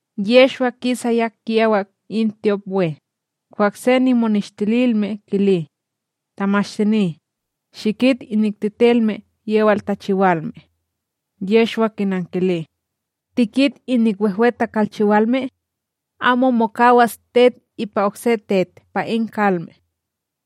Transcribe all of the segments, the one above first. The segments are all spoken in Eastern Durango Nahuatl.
Yehshwa kisaya kiyawak in tyopWe, kwah se nimoneshtililme kili: ―Tamashtini, shikit inik tetelme yewal takalchiwalme! Yehshwa kinankili: ―Tikit inik wehwe takalchiwalme? Amo mokawas tet ipa okse tet pa in kalme.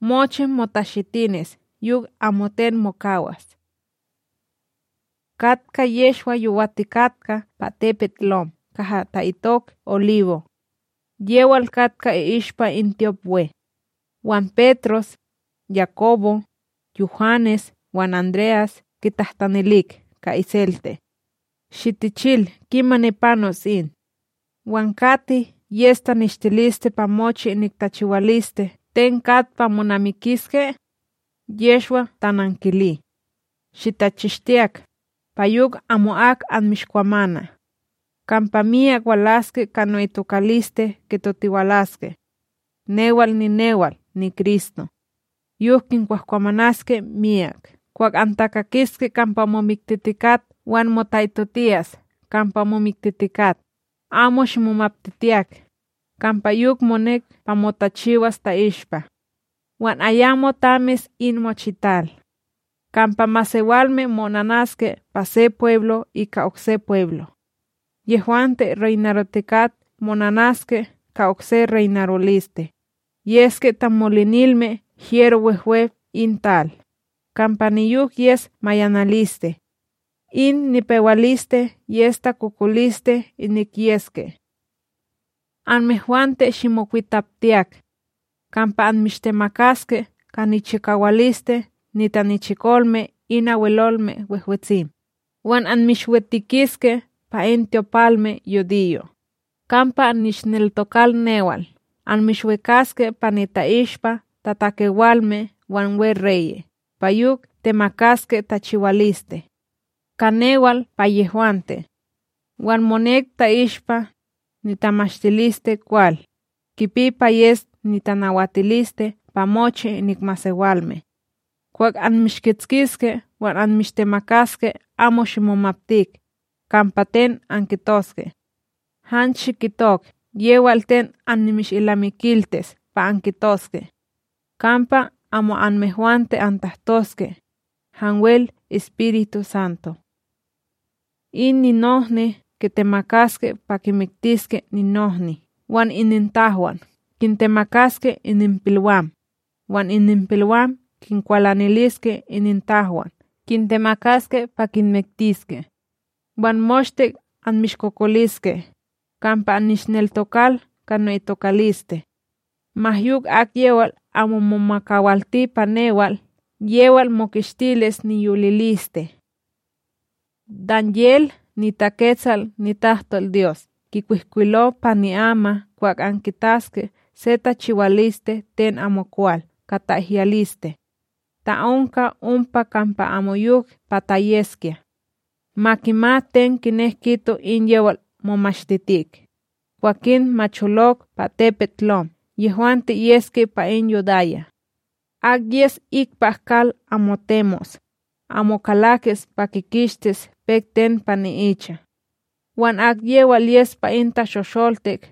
Mochi motashitinis yok amoten mokawas. Katka Yehshwa yowatikatka pa tepetLom kaha ta'itok Oliwo', yewal katka i'ishpa in tyopWe. Wan Petros, Yakobo, Yuhanes wan André'as kitahtanilik ka iselte: ―Shitichil kimani panos in. Wan kati yes taneshtiliste pa mochi inik tachiwaliste ten kat pa monamikiske? Yehshwa tanankili: ―Shitachishtiyak, pa yok amo'ak anmishkwamana. Kampa myak walaske ka no'itokaliste kitotiwalaske: “Newal ninewal niKristo”; yok kinkwahkwamanaske myak. ’Kwah antakakiske kampa momiktitikat wan mota'itotiyas kampa momiktitikat, amo shimomaptitiyak, kampa yok monek pa motachiwas ta'ishpa; wan ayamo tamis in mochital. Kampa masewalme mo'onanaske pa se pweblo' ika okse pweblo'; yehwante reynarotikat mo'onanaske ka okse reynaroliste, yeske tamolinilme hyero wehwe in tal, kampa niyok yes mayanaliste. In nipewaliste yes takokoliste inik yeske. ’Anmehwante shimokwitaptiyak; kampa anmishtemakaske ka nichikawaliste nitanichikolme in Abwelolme Wehwetsim, wan anmishwitikiske pa in tyopalmeYudiyo'. Kampa annishneltokal newal anmishwikaske pa nita'ishpa tatakewalme wan weReye' pa yok temakaske tachiwaliste; ka newal pa yehwante. Wan monek ta'ishpa, nitamashtilisteKwal, kipi pa yes nitanawatiliste pa mochi inik masewalme. Kwah anmishkitskiske wan anmishtemakaske amo shimomaptik, kampa ten ankitoske. Han shikitok yewal ten anmishilnamikiltis pa ankitoske; kampa amo anmehwante antahtoske, hanwel EspirituSanto. In ninohni kitemakaske pa kimiktiske ninohni wan inintahwan kintemakaske ininpilwam, wan ininpilwam kinkwalaniliske inintahwan kintemakaske pa kinmiktiske. Wan moshte anmishkokoliske kampa annishneltokal ka no'itokaliste; ma yok akyewal amo momakawilti pa newal, yewal mokishtilis niyoliliste. ’Danyel niTaketsal nitahtolDyos kikwihkwilo pa ni'ama kwah ankitaske se tachiwaliste ten amokwal ka ta'ihyaliste; ta onka ompa kampa amoyok pa ta yeskya —ma kimat ten kinek kito in yewal momashtitik—, kwakin ma cholok pa tepetLom yehwante yeske pa in Yudaya. Ak yes ikpak kal amo temos, amo kalakis pa kikishtis pek ten pa ni'icha; wan akyewal yes pa in tashosholtik,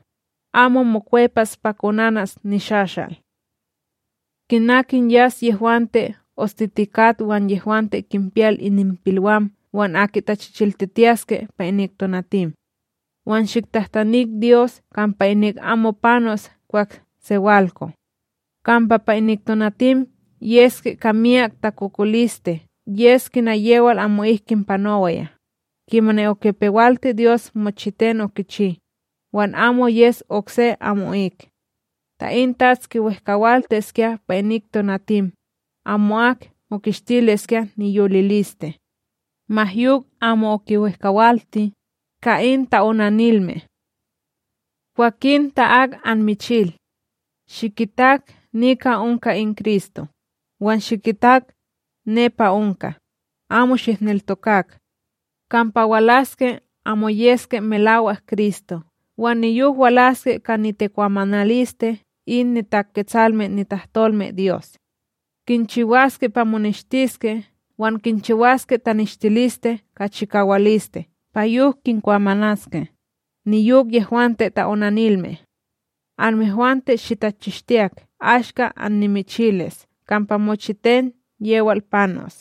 amo mokwepas pa konanas nishashal. Kina kinyas yehwante ostitikat wan yehwante kinpiyal ininpilwam wan aki tachichiltitiyaske pa inik tonatim! Wan shiktahtanik Dyos, kampa inik amo panos kwah sewalko; kampa pa inik tonatim yeske ka miyak takokoliste yes kina yewal amo'ik kinpanowaya, kimani okipewalti Dyos mochiten okichi, wan amo yes okse amo'ik. Ta in TATS kiwehkawaltiskya pa inik tonatim, amo'ak mokishtiliskya niyoliliste; ma yok amo okiwehkawalti, ka in ta'onanilme. ’Kwakin ta ak anmichil: “Shikitak, nika onka in Kristo”, “Wan Shikitak, nepa onka”, amo shihneltokak. Kampa walaske amo yeske melawak Kristo' wan niyok walaske ka nitikwamanaliste in niTaketsalme nitahtolmeDyos; kinchiwaske pa moneshtiske wan kinchiwaske taneshtiliste ka chikawaliste pa yok kinkwamanaske, niyok yehwante ta'onanilme. Anmehwante shitachishtiyak ashka annimichilis kampa mochiten yewal panos.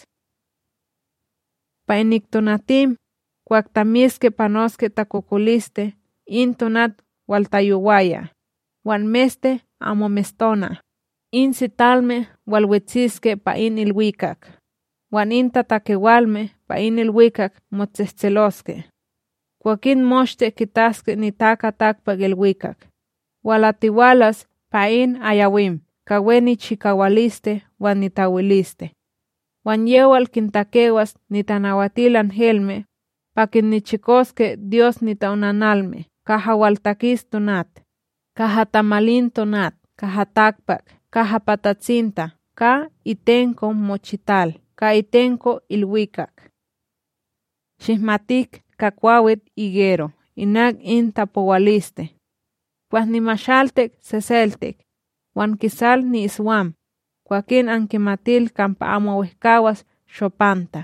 ’Pa inik tonatim, kwah tamiske panoske takokoliste in tonat waltayowaya, wan meste amo mestona, in sitalme walwetsiske pa in ilwikak, wan in tatakewalme pa ilwikak motsehtseloske. Kwakin moshte kitaske NitakaTakpakIlwikak, walatiwalas pa in ayawim ka we nichikawaliste wan nitawiliste. Wan yewal kintakewas nitanawatilanhelme, pa kinnichikoske Dyos nita'onanalme kaha waltakis tonat, kaha tamalin tonat kaha takpak kaha pa tatsinta ka itenko mochital ka itenko ilwikak. ’Shihmatik ka kwawitIgero inak in tapowaliste: Kwah nimashaltik seseltik, wan kikisal ni'iswam, kwakin ankimatil kampa amo wehkawas shopanta.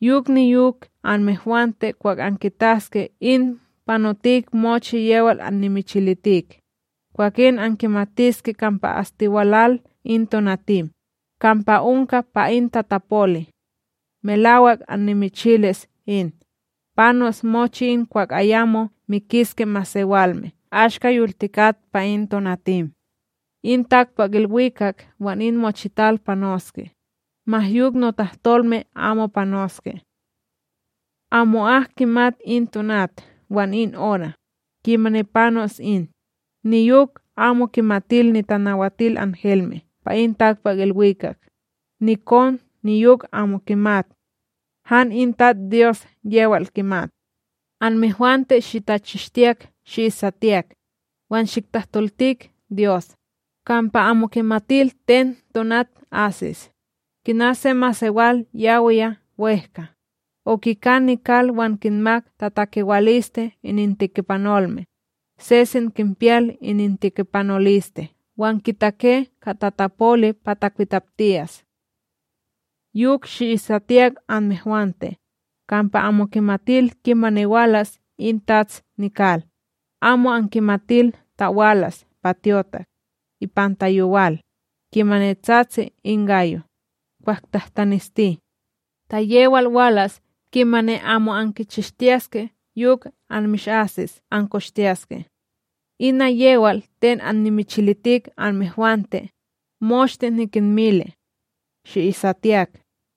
Yok niyok anmehwante kwah ankitaske in panotik mochi yewal annimichilitik, kwakin ankimatiske kampa astiwalal in tonatim, kampa onka pa in tatapoli. Melak annimichilis in, panos mochi in kwah ayamo mikiske masewalme ashka yoltikat pa in tonatim. In takpakIlwikak wan in mochital panoske, ma yok notahtolme amo panoske. ’Amo'ak kimat in tonat wan in ora, kimani panos in, niyok amo kimatil nitanawatilanhelme pa in takpakIlwikak, niKon niyok amo kimat. Han in TatsDyos yewal kimat. ’Anmehwante shitachishtiyak shi'isatiyak, wan shiktahtoltik Dyos, kampa amo ankimatil ten tonat asis. Kina se masewal yawiya wEhka, okika nikal wan kinmak tatakewaliste inintikipanolme, sesen kinpiyal inintikipanoliste wan kitake ka tatapoli pa takwitaptiyas. Yok shi'isatiyak anmehwante, kampa amo ankimatil kimani walas in tats nikal, amo ankimatil ta walas pa tyotak, ipanta yowal, kimani tsatsi in gayo, kwah tahtanesti; ta yewal walas kimani amo ankichishtiyaske yok anmishasis ankoshtiyaske. Ina yewal ten annimichilitik anmehwante, moshte nikinmili: Shi'isatiyak.